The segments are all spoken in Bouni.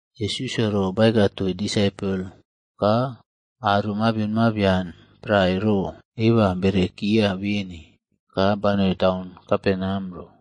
Yesusꞌyo ro baeka toii disaipol ka aro mabion mabian prae ro eba berekia beni, ka banoi taun Kaperneam ro.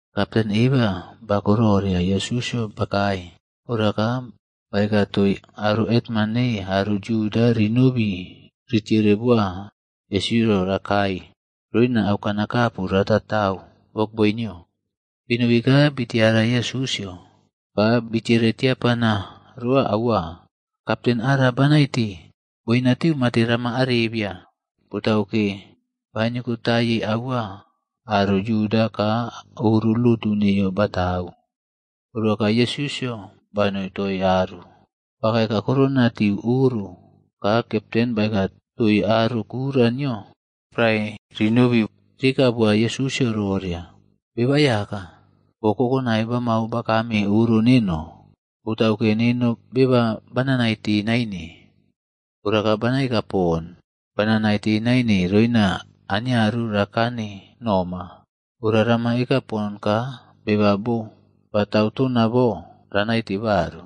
Kapten eba bako roria Yesusꞌyo bakae, ora ka baeka toii aro hetman nei aro Yuda rinobi ritere boa Yesusꞌyo rakae roina auꞌkanakapu rataꞌtau wokboi nio. Binobi ka bii tiara Yesusꞌyo, ka bitiere tiapana roa aua, “Kapten ara banaite, boinatiu mate rama arebiya, botauke, baniokotaiye aua aro Yuda ka oro lotu neiyo batau.” Ora ka Yesusꞌyo banoi toii aru. Bakae kakurona tiu oro, ka kapten baeka toii aro kura nio prae rinobi rieka boa Yesusꞌyo roria, “Beba Aiyaka, boo kokonai bamau bakame oro neno, botauke neno beba bana naite naine. Ora ka bana eka pon, bana naite naine roina aniaru rakane noma. Ora rama eka pon ka beba boo batau tona bo raꞌnaite baru.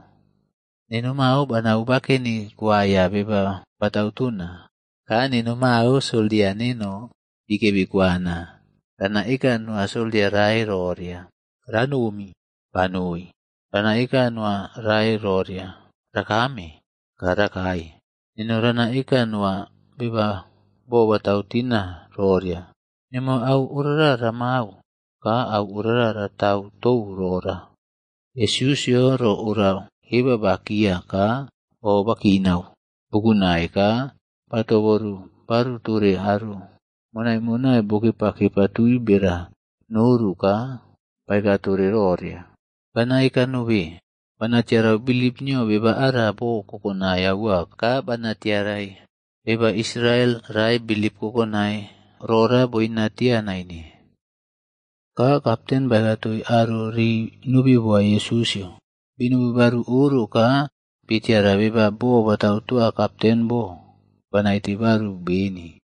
Neno mao banau bakeni kuaiya beba batau tona. Ka neno mao soldia neno bikebi kuwana. Rana eka noa soldia rae roria, ‘Ranom,’ banoi. Rana eka noa rae roria, ‘Rakame,’ ka rakae. Neno rana eka noa beba boo batau tina roria, ‘Nemo au orara ramau,’ ka au orara ratau tou rora.” Yesusꞌyo ro ora eba bakia ka o bakinau bukunai ka ba toboru baru tore aro monai monai bokepaꞌkepa tui bera noru ka baeka tore roria, “Bana eka nobe, bana tiarau bilip nio beba ara bo kokonai aua ka bana tiarai beba Israel rae bilip kokonai rora boina tii naine.” Ka kapten baeka toii aro rii nobi boa Yesusꞌyo, binobi baru oro ka bitiara beba boo batau toa kapten bo ba naite baru beni.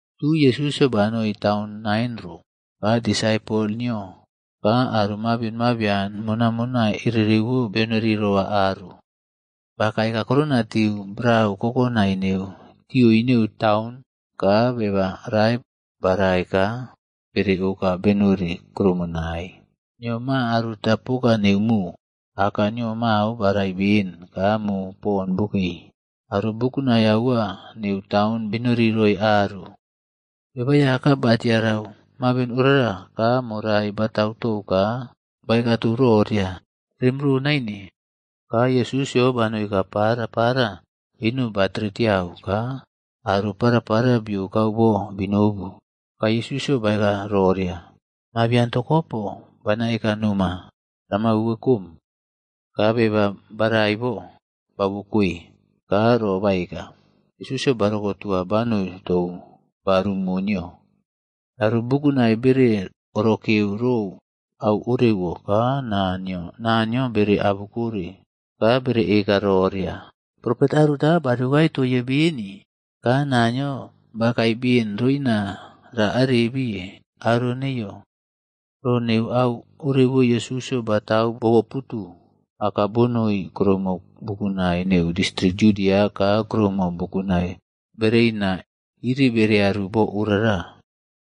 Tui Yesusꞌyo banoi taun Nain ro, ka disaipol nio ka aro mabion mabian monaiꞌmonai erewo benori roa aru. Bakae kakurona tiu brau kokonai neu tioi neu taun, ka beba rae barai ka bere oka benori kuromonai. Nio ma aruta poka neu mo. Aka nio mao barai ben ka mo pon bokei. Aro bukunai aua neu taun benori roi aru. Beba Aiyaka ba tiarau mabion orara, ka morai batau tou ka baeka tou roria, “Rem ro naine.” Ka Yesusꞌyo banoi ka parapara eno ba tere tiau ka aro parapara biokau bo binobu. Ka Yesusꞌyo baeka roria, “Mabian tokopo, bana eka noma, rama uwekom.” Ka beba barai bo, bauwokoe ka ro kaeka. Yesusꞌyo ba rokotua banoi tou baru mo nio. Aro bukunai bere orokeu rou au orewo ka naa nio Naniyo bere abukore. Ka bere eka roria, “Profet aruta bariokae toiye beni,” ka “Naniyo bakae beni roina ra arebii aro neiyo.” Ro neu au orewo Yesusꞌyo batau boꞌboputu aka bonoi kuroumo bukunai neu distrik Yudia ka kuroumo bukunai bereina iriꞌbearu bo orara.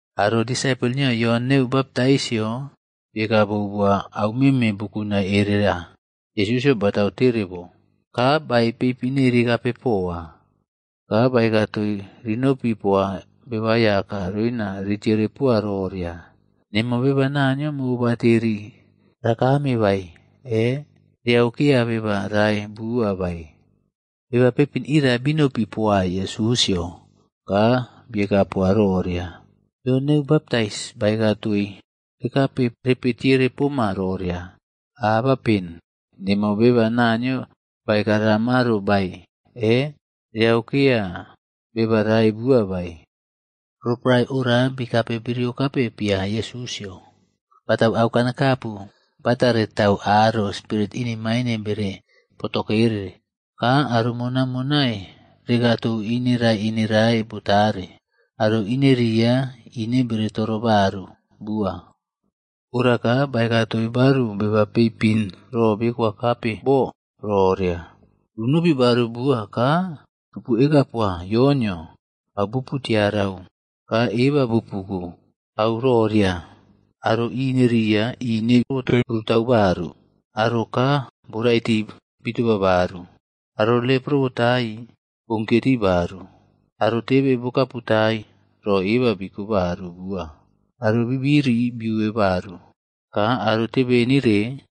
Aro disaipol nio Yon neu Baptaisꞌyo,a bieka bou boa au meme bukunai erera Yesusꞌyo batau tere bo, ka baei peipin nei rikape poa. Ka baeka toii rinopi poa Beba Aiyaka roina ritere poa roria, “Nemo beba Naniyo mobateri rakame bae, e? Reaukeya beba rai bua bae?” Beba peipin iria binopi poa Yesusꞌyo, ka bieka poa roria, “Yon neu Baptais baeka toii rekape repe tiere poma roria, ‘Abapen nemo beba Naniyo baeka ramaro bae, e? Reaukeya beba rae bua bae?’” Roporae ora bikape biriokape pia Yesusꞌyo, batau auꞌkanakapu batare tau aro spirit inemain bere potokere, ka aro mona monai rekaꞌtou ineꞌrae ineꞌrae botare, aro ineria, ine bere toro baru bua. Ora ka baeka toii baru beba peipin ro bikwakape bo roria, “Runopi baru bua ka rupu eka poa Yonꞌyo au bupu tiarau ka eba bupu ko. Au roria aro ineꞌria ine botai prutau baru, aro kaa borai tii bitoba baru, aro lepro botaii bounkiye tii baru, aro tebe kaputai ro eba bereko baru bua, aro bibiri biuwe baru, ka aro tebenire,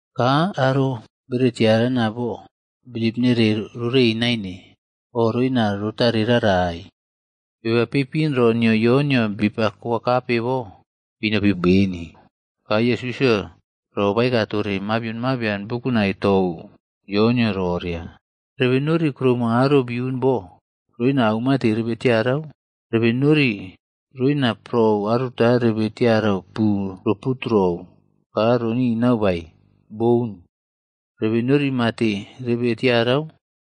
Ka aro bere tiarana bo bilip nere rorei naine o roina rotare rarai.” Beba peipin ro nio Yonꞌyo bipa koakape bo binopi beni. Ka Yesusꞌyo ro baeka tore mabion mabian bukunai tou Yonꞌyo roria, “Rebe nori kuroumo aro biun bo roina aumate rebe tiarau? Rebe nori roina prou aruta rebe tiarau pu ro puturou ka roꞌninau bae? Boun. Rebe nori mate rebe tiarau?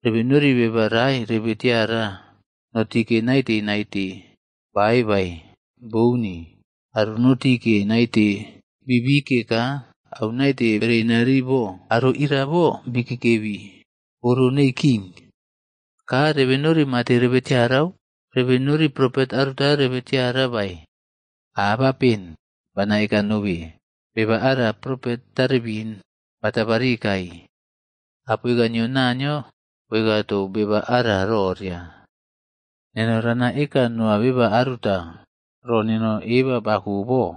Rebe nori beba rae rebe tiara noꞌtike naite naite ba ae bae? Bouni, aro noꞌtike naite biꞌbike ka au naite bereina rii bo, aro ira bo bikeꞌkebi oro nei king. Ka rebe nori mate rebe tiarau? Rebe nori propet aruta rebe tiara bae? “Abapen! Bana eka nobe, beba ara propet taribin ba tabarikai. Apoika nio Naniyo boeka tou beba ara roria, ‘Neno rana eka noa beba aruta, ro neno eba bako bo,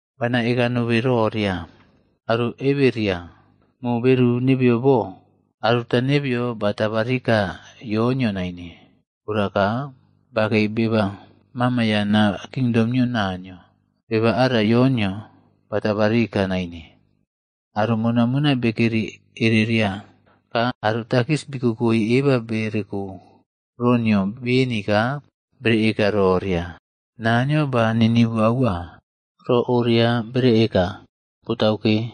“Bana eka nobe roria, aro eberia mo beru nebe bo, aruta nebeyo ba tabarika Yonꞌyo naine. Ora ka bakei beba mamayana kingdom nio Naniyo, Beba ara Yonꞌyo batabarika naine.” Aro monai monai bekeri ereria ka aro takis bii koꞌkoi eba bereko ro nio beni ka bere eka roria, “Naniyo ba ninivu aua.” Ro oria bere eka, botauke,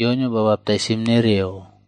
Yonꞌyo ba baptaisim nereo.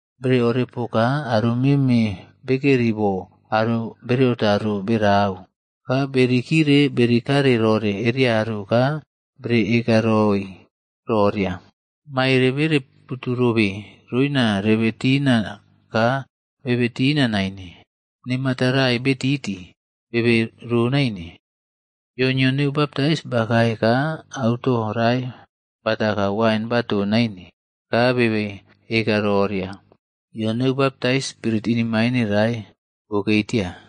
Bere orepoka aro meme bekeri bo aro bereotaro berau, ka berikire berikare rore ereyaru ka bere ekaroi roria, ‘Maere bere putu robe roina rebe tina ka bebe tina naine, ne mata rai betiti bebe ro naine.’ “Yon neu Baptais bakae ka auto rae bata ka wain baton naine, ka bebe eka roria, ‘Yon Neu Baptais, spirit inemaine rae bokei tia.’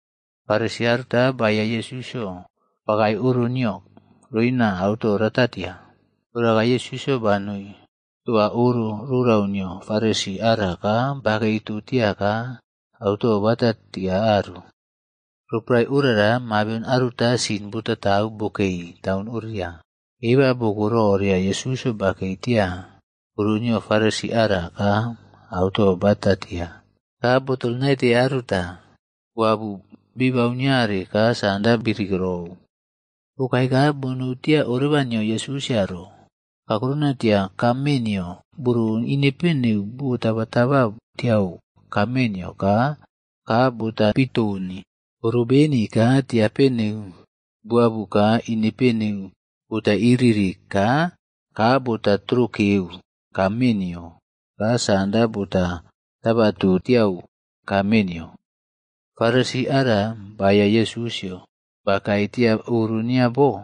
Farisi aruta baeya Yesusꞌyo bakae oro nio roina auto ratatia. Ora ka Yesusꞌyo banoi toa oro rorau nio Farisi ara ka bakeito tia ka auto batatia aru. Roporae orara mabion aruta sin botaꞌtau bokei taun oria. Eba boko roria Yesusꞌyo bakei tia oro nio Farisi ara ka auto bata tia. Ka botol naite aruta boabu bibau niare ka sanda birikirou. Bokae ka bonou tia oreba nio Yesusꞌyo ro, kakurona tia kaaꞌme nio boro ineꞌpe neu bo taba taba tiau kaa nio ka kaa bota pitoni. Boꞌro beni ka tiape neu boabu ka inepe neu bota iri-iri ka kaa bota trokeu kaaꞌme nio ka sanda bota tabatu tiau kaaꞌme nio. Farisi ara baeya Yesusꞌyo bakae tia oro nio bo,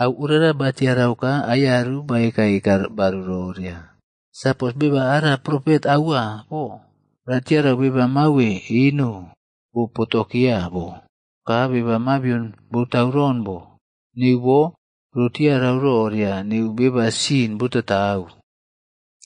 au orewo ba tiarau ka aiyaru baeka eka baru roria, “Sapos beba ara Profet aua bo ratiarau beba mawe eno bo potekeya bo, ka beba mabion boꞌtauron bo. Neu bo, roꞌtiarau roria neu beba sin botaꞌtau.”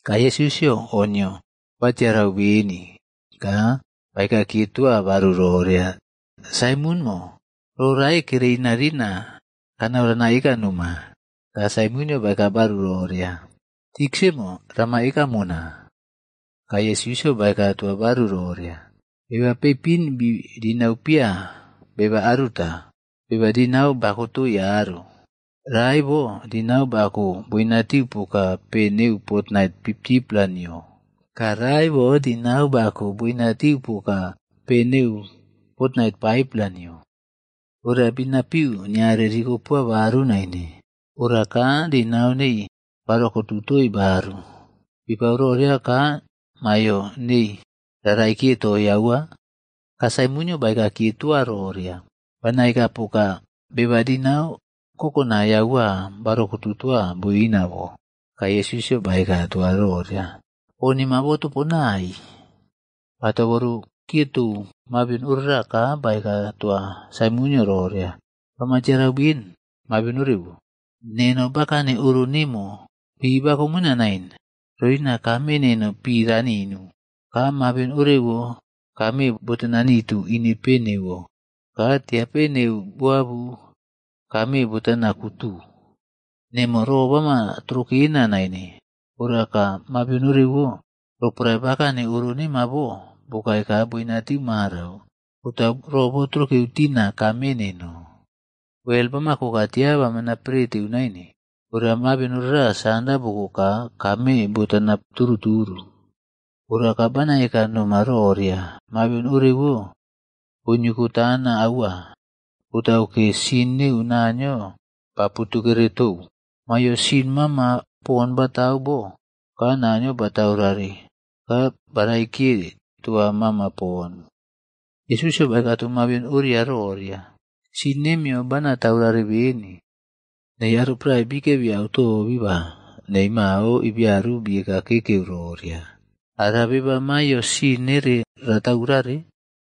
Ka Yesusꞌyo o nio batiarau beni ka baeka kiye toa baru roria, “Saimonꞌmo, ro rae kere inarina kanau rana eka noma.” Ka Saimonꞌyo baeka baru roria, “Tiksaꞌmo, rama eka mona.” Ka Yesusꞌyo baeka toa baru roria, “Beba peipin bii dinau pia beba aruta beba dinau ba koꞌkotoi aro. Rae bo dinau bako boinatiu poka pe neu fotnait 50-pla nio ka rae bo dinau boko boinatiu poka pe neu fotnait 5-pla nio. Ora binapiu niare rikopoa baru naine. Ora ka dinau nei barokotu toii baru. Bipau roria ka maiyo neii ra raikiye toii aua?” Ka Saimonꞌyo baeka kiye toa roria, “Bana eka poka beba dinau kokonai aua barokotu boina bo.” Ka Yesusꞌyo baeka toa roria, “O nemo botoponai.” Ba toboru kiye tou mabion ora ka baeka toa Saimonꞌyo roria, “Bama tiarau ben mabion orewo? Neno bakane oro rorau nemo, pi bakomona naine roina kaaꞌme neno pi raninu, ka mabion orewo kaaꞌme botana nitu ineꞌpi neuwo ka tiape neu boabu kaaꞌme botana kutu. Nemo ro bama trokena naine, ora ka mabion orewo, roporae bakeni oro rorau nemo bo bokae ka boinatiu marau, botau ro botrokeu tina kaaꞌme neno. Wel bama ko ka tia bamana preteu naine, ora mabion orara sanda boko ka kaaꞌme botana turuꞌturu. Ora ka bana eka noma roria, mabion orewo boniokotana aua, botau ke sin neu Naniyo baputukere tou. Maiyo sin mama pon batau bo ka Naniyo bataurare, ba raikiye toa mama poni.” Yesusꞌyo baeka tou mabion oria roria, “Sin nemiyo bana taurare beni.” Nei aro prae bikebi auto biba nei mao ibiaru bieka keꞌkeu roria, “Ara beba maiyo sin nere ra taurare?”